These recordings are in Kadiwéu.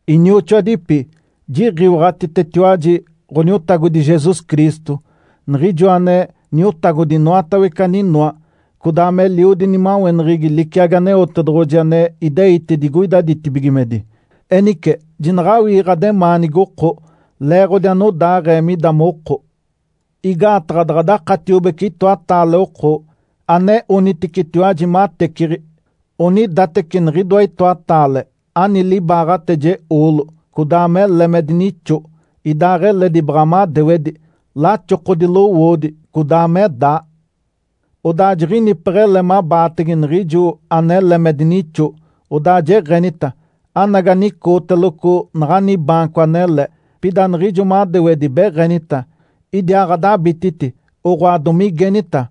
Inioxoadipi, jiɡ̶iwaɡ̶atitetiwaji Ǥoniotagodi Jesus Cristo, Niɡ̶ijoa ane Niotagodi inoatawece aninoa, codaa meliodi nimaweneɡ̶egi liciagi Aneotedoɡ̶oji ane ideite digoida ditibigimedi. Enice, jinaɡ̶awii ɡ̶ademaanigi oko leeɡ̶odi anodaaɡ̶ee mida moko. Igaataɡ̶a daɡ̶a dakatiobece itoataale oko ane oniticetiwaji mateciɡ̶i, onidateci niɡ̶idoa itoataale ani libaaɡ̶ateje oolo codaa mele me dinixo, ideɡ̶eledi baɡ̶a madewedi, laxokodi lowoodi codaa me daa. Odaa jiɡ̶inipeɡ̶ele mabaatege niɡ̶ijo anele me dinixo, odaa jeɡ̶enita, “Anagi anicooteloco naɡ̶ani baanco anele”, pida niɡ̶ijo madewedi beɡ̶enita, “Idiaaɡ̶adabititi!”, oɡ̶oa, domigenita,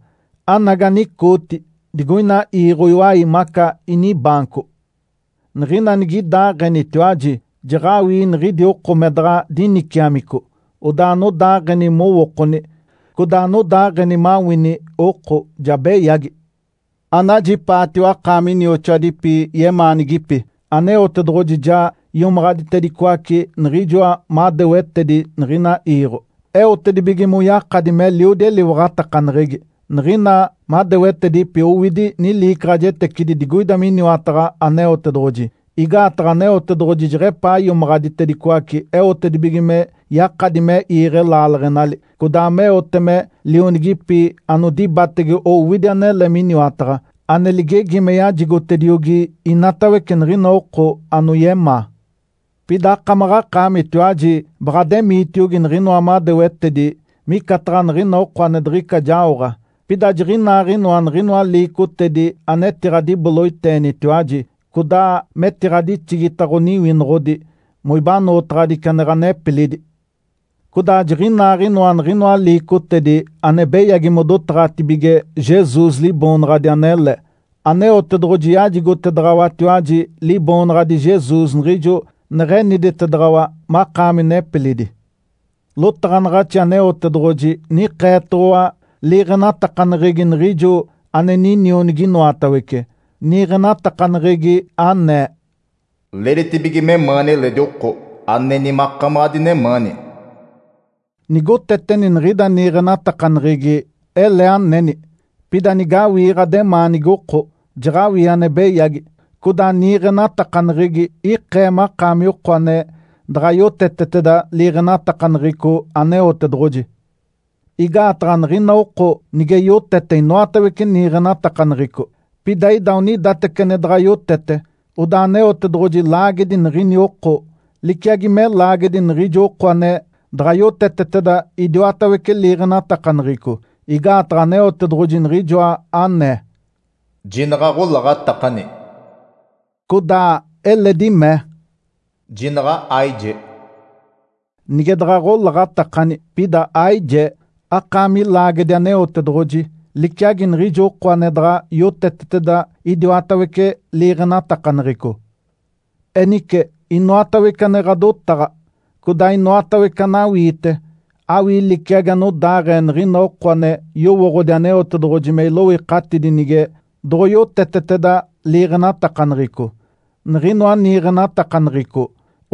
“Anagi anicooti digoina iiɡ̶o iwai maca inibaanco!” Niɡ̶ina nigidaaɡ̶enitiwaji, jaɡ̶awii niɡ̶idi oko me daɡ̶a diniciamico, odaa anodaaɡ̶eni mowookoni, codaa anodaaɡ̶eni mawini oko ja beyagi. Anajipaatiwa akaami inioxoadipi yemaanigipi! Aneotedoɡ̶oji ja iomaɡ̶aditedicoace niɡ̶ijoa madewetedi niɡ̶ina iiɡ̶o, eotedibige moyakadi meliodi eliwaɡ̶atakaneɡ̶egi. Niɡ̶ina madewetedipi owidi niliicaɡ̶ajetecidi digoida miniwataɡ̶a Aneotedoɡ̶oji, igaataɡ̶a Aneotedoɡ̶oji jeɡ̶epaa iomaɡ̶aditedicoace eotedibige me yakadi me iiɡ̶e laaleɡ̶enali, codaa meote me lionigipi anodibatege owidi anele miniwataɡ̶a, ane ligegi me yajigotediogi inatawece niɡ̶ina oko anoyemaa. Pida akamaɡ̶akaamitiwaji baɡ̶ademiitiogi niɡ̶inoa madewetedi micataɡ̶a niɡ̶ina oko ane diɡ̶ica jaoɡ̶a. Pida jiɡ̶inaaɡ̶inoa niɡ̶inoa liicotedi anetiɡ̶adiboloiteenitiwaji, codaa metiɡ̶adixigita ɡ̶oniwinoɡ̶odi moibanootaɡ̶adici ane ɡ̶anepilidi. Codaa jiɡ̶inaaɡ̶inoa niɡ̶inoa liicotedi ane beyagi modotaɡ̶atibige Jesus Liboonaɡ̶adi anele. Aneotedoɡ̶oji yajigotedaɡ̶awatiwaji Liboonaɡ̶adi Jesus niɡ̶ijo neɡ̶eniditedaɡ̶awa makaami nepilidi. Lotaɡ̶anaɡ̶axi Aneotedoɡ̶oji nikeetoɡ̶owa liiɡ̶enatakaneɡ̶egi niɡ̶ijo ane Ninionigi inoatawece, niiɡ̶enatakaneɡ̶egi anee, “Leeditibige memaani eledi oko aneni makamaɡ̶a adinemaani.” Nigoteteni niɡ̶ida niiɡ̶enatakaneɡ̶egi, ele aneni. Pida nigawii ɡ̶ademaanigi oko, jaɡ̶awii ane beyagi, codaa niiɡ̶enatakaneɡ̶egi ikee makaami oko ane daɡ̶a yoteteteda liiɡ̶enatakaneɡ̶eco Aneotedoɡ̶oji. Igaataɡ̶a niɡ̶ina oko nige yotete inoatawece niiɡ̶enatakaneɡ̶eco, pida ida onidateci ane daɡ̶a yotete, odaa Aneotedoɡ̶oji laagedi niɡ̶ini oko liciagi me laagedi niɡ̶ijo oko ane daɡ̶a yoteteteda idiwatawece liiɡ̶enatakaneɡ̶eco. Igaataɡ̶a Aneotedoɡ̶oji niɡ̶ijoa anee, “Jinaɡ̶aɡ̶olaɡ̶atakani!” Codaa eledi mee, “Jinaɡ̶a aijee!” Nige daɡ̶a aɡ̶olaɡ̶atakani, pida aijee, akaami laagedi Aneotedoɡ̶oji liciagi niɡ̶ijo oko ane daɡ̶a yoteteteda idiwatawece liiɡ̶enatakaneɡ̶eco. Enice, inoatawece ane ɡ̶adotaɡ̶a, codaa inoatawece anawiite, awii liciagi anodaaɡ̶ee niɡ̶ina oko ane yowooɡ̶odi Aneotedoɡ̶oji me iloikatidi nige doɡ̶oyoteteteda liiɡ̶enatakaneɡ̶eco. Niɡ̶inoa niiɡ̶enatakaneɡ̶eco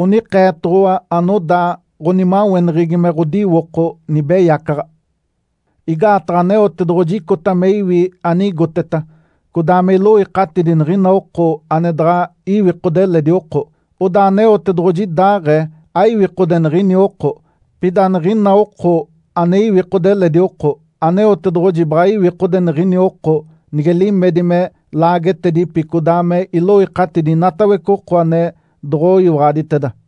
onikeetoɡ̶owa anodaa ɡ̶onimaweneɡ̶egi me ɡ̶odiwoko nibeyacaɡ̶a. Igaataɡ̶a Aneotedoɡ̶oji icota me iwi anigoteta, codaa me iloikatidi niɡ̶ina oko ane daɡ̶a iwikode eledi oko. Odaa Aneotedoɡ̶oji idaaɡ̶ee aiwikode niɡ̶ini oko. Pida niɡ̶ina oko ane iwikode eledi oko, Aneotedoɡ̶oji baɡ̶a iwikode niɡ̶ini oko nige limedi me laagetedipi codaa me iloikatidi inatawece oko ane doɡ̶oyiwaɡ̶aditeda.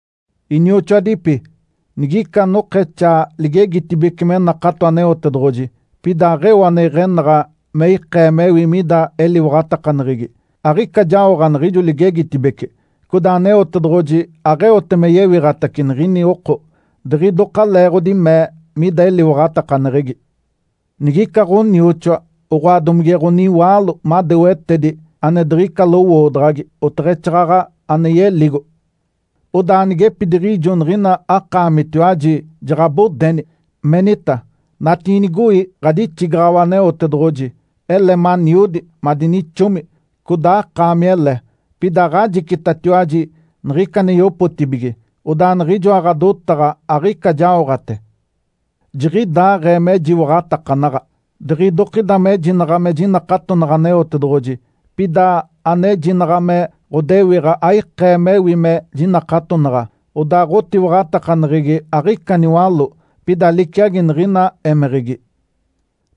Inioxoadipi, nigica anokexaa ligegitibece me nakato Aneotedoɡ̶oji, pida aɡ̶eo ane iɡ̶enaɡ̶a me ikee mewi mida eliwaɡ̶atakaneɡ̶egi, aɡ̶ica jaoɡ̶a niɡ̶ijo ligegitibece. Codaa Aneotedoɡ̶oji aɡ̶eote me yewiɡ̶atace niɡ̶ini oko diɡ̶idoka leeɡ̶odi mee mida eliwaɡ̶atakaneɡ̶egi. Nigica ɡ̶onioxoa, oɡ̶oa domige ɡ̶oniwaalo madewetedi ane diɡ̶ica lowoodaɡ̶agi, oteɡ̶exaaɡ̶aɡ̶a ane yeligo. Odaa anigepidiɡ̶ijo niɡ̶ina akaamitiwaji jaɡ̶abodeni, menita, “Natiinigoi, ɡ̶adixigaɡ̶awa Aneotedoɡ̶oji! Ele maniodi, madinixomi, codaa akaamele!” Pida aɡ̶ajicitatiwaji niɡ̶ica ane yopotibige. Odaa niɡ̶ijoa ɡ̶adotaɡ̶a aɡ̶ica jaoɡ̶ate. Jiɡ̶idaaɡ̶ee mejiwaɡ̶atakanaɡ̶a. Diɡ̶idokida mejinaɡ̶a me jinakatonaɡ̶a Aneotedoɡ̶oji, pida anejinaɡ̶a me ɡ̶odewiɡ̶a aikee mewi me jinakatonaɡ̶a, odaa ɡ̶otiwaɡ̶atakaneɡ̶egi aɡ̶ica niwaló, pida liciagi niɡ̶ina émeɡ̶egi.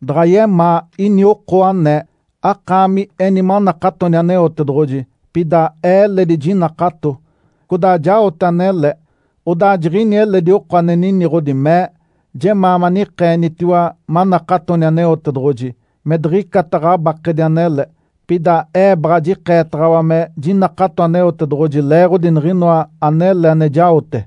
Daɡ̶a yemaa ini oko anee, “Akaami eni manakatoni Aneotedoɡ̶oji. Pida ee eledi jinakato, codaa jaote anele.” Odaa jiɡ̶ini eledi oko ane niniɡ̶odi, mee, “Jemaa manikeenitiwa manakatoni Aneotedoɡ̶oji, me diɡ̶icata ɡ̶abakedi anele. Pida ee baɡ̶a jikeetaɡ̶awa me jinakato Aneotedoɡ̶oji leeɡ̶odi niɡ̶inoa anele ane jaote.”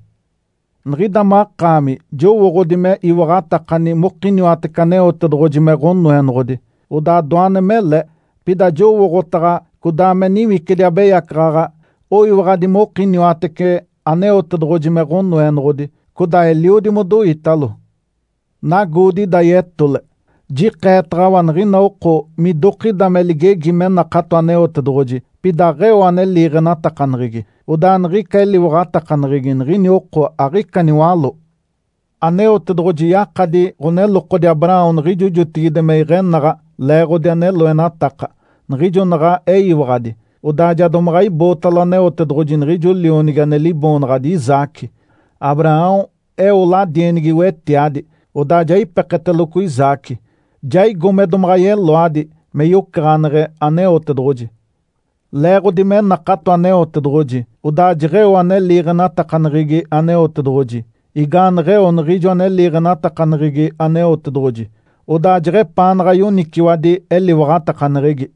Niɡ̶ida makaami jowooɡ̶odi me iwaɡ̶atakani mokiniwatece Aneotedoɡ̶oji me Ǥonoenoɡ̶odi. Odaa doane mele! Pida jowooɡ̶otaɡ̶a codaa me niwicidi abeyacaɡ̶aɡ̶a oyiwaɡ̶adi mokiniwatece Aneotedoɡ̶oji me Ǥonoenoɡ̶odi, codaa eliodi modoitalo. Nagoodi ida yetole! Jikeetaɡ̶awa niɡ̶ina oko midokida me ligegi me nakato Aneotedoɡ̶oji, pida aɡ̶eo ane liiɡ̶enatakaneɡ̶egi, odaa niɡ̶ica eliwaɡ̶atakaneɡ̶egi niɡ̶ini oko aɡ̶ica niwaló. Aneotedoɡ̶oji yakadi ɡ̶onelokodi Abraão niɡ̶ijo jotigide me iɡ̶enaɡ̶a leeɡ̶odi ane loenataka, niɡ̶ijo naɡ̶a eyiwaɡ̶adi, odaa ja domaɡ̶a ibootalo Aneotedoɡ̶oji niɡ̶ijo lionigi ane liboonaɡ̶adi Isaque. Abraão eo ladienigi wetiadi, odaa ja ipeketeloco Isaque, jaigo me domaɡ̶a yeloadi me yocaɡ̶aneɡ̶e Aneotedoɡ̶oji. Leeɡ̶odi me nakato Aneotedoɡ̶oji, odaa jeɡ̶eo ane liiɡ̶enatakaneɡ̶egi Aneotedoɡ̶oji. Igaaneɡ̶eo niɡ̶ijo ane liiɡ̶enatakaneɡ̶egi Aneotedoɡ̶oji, odaa jeɡ̶epaanaɡ̶a yoniciwadi eliwaɡ̶atakaneɡ̶egi.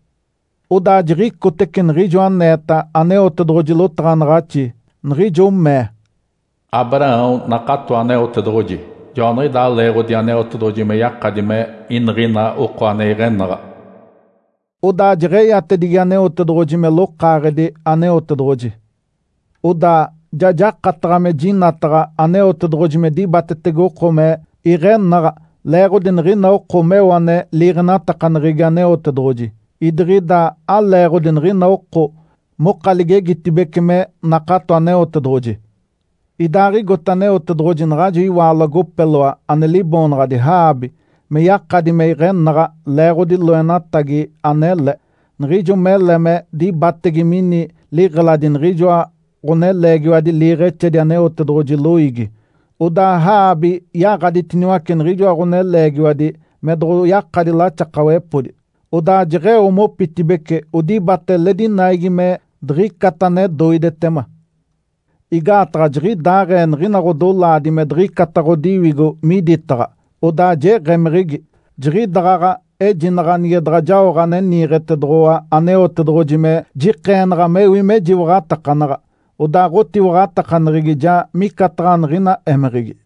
Odaa jiɡ̶icotece niɡ̶ijo aneeta Aneotedoɡ̶oji lotaɡ̶anaɡ̶axi, niɡ̶ijo mee, “Abraão nakato Aneotedoɡ̶oji, joaniɡ̶idaa leeɡ̶odi Aneotedoɡ̶oji me yakadi me iniɡ̶ina oko ane iɡ̶enaɡ̶a.” Odaa jeɡ̶eyatedigi Aneotedoɡ̶oji me “Lokaaɡ̶edi Aneotedoɡ̶oji”. Odaa ja jakataɡ̶a me jinataɡ̶a Aneotedoɡ̶oji me dibatetege oko me iɡ̶enaɡ̶a leeɡ̶odi niɡ̶ina oko meo ane liiɡ̶enatakaneɡ̶egi Aneotedoɡ̶oji, idiɡ̶ida aleeɡ̶odi niɡ̶ina oko moka ligegitibece me nakato Aneotedoɡ̶oji. Idaaɡ̶igote Aneotedoɡ̶oji naɡ̶ajo iwaalo agopeloa ane liboonaɡ̶adi Raabe me yakadi me iɡ̶enaɡ̶a leeɡ̶odi loenatagi anele, niɡ̶ijo mele me dibatege mini liɡ̶eladi niɡ̶ijoa ɡ̶oneleegiwadi liiɡ̶exedi Aneotedoɡ̶oji loiigi. Odaa Raabe yaɡ̶aditiniwace niɡ̶ijoa ɡ̶oneleegiwadi me doɡ̶oyakadi laxakawepodi, odaa jeɡ̶eo mopitibeci odibata eledi naigi me diɡ̶icata ane doidetema. Igaataɡ̶a jiɡ̶idaaɡ̶ee niɡ̶ina ɡ̶odolaadi me diɡ̶icata ɡ̶odiwigo miditaɡ̶a, odaa jeɡ̶emeɡ̶egi. Jiɡ̶idaɡ̶aɡ̶a ejinaɡ̶a nige daɡ̶a jaoɡ̶a ane niiɡ̶etedoɡ̶owa Aneotedoɡ̶oji me jikeenaɡ̶a mewi mejiwaɡ̶atakanaɡ̶a, odaa ɡ̶otiwaɡ̶atakaneɡ̶egi ja micataɡ̶a niɡ̶ina émeɡ̶egi.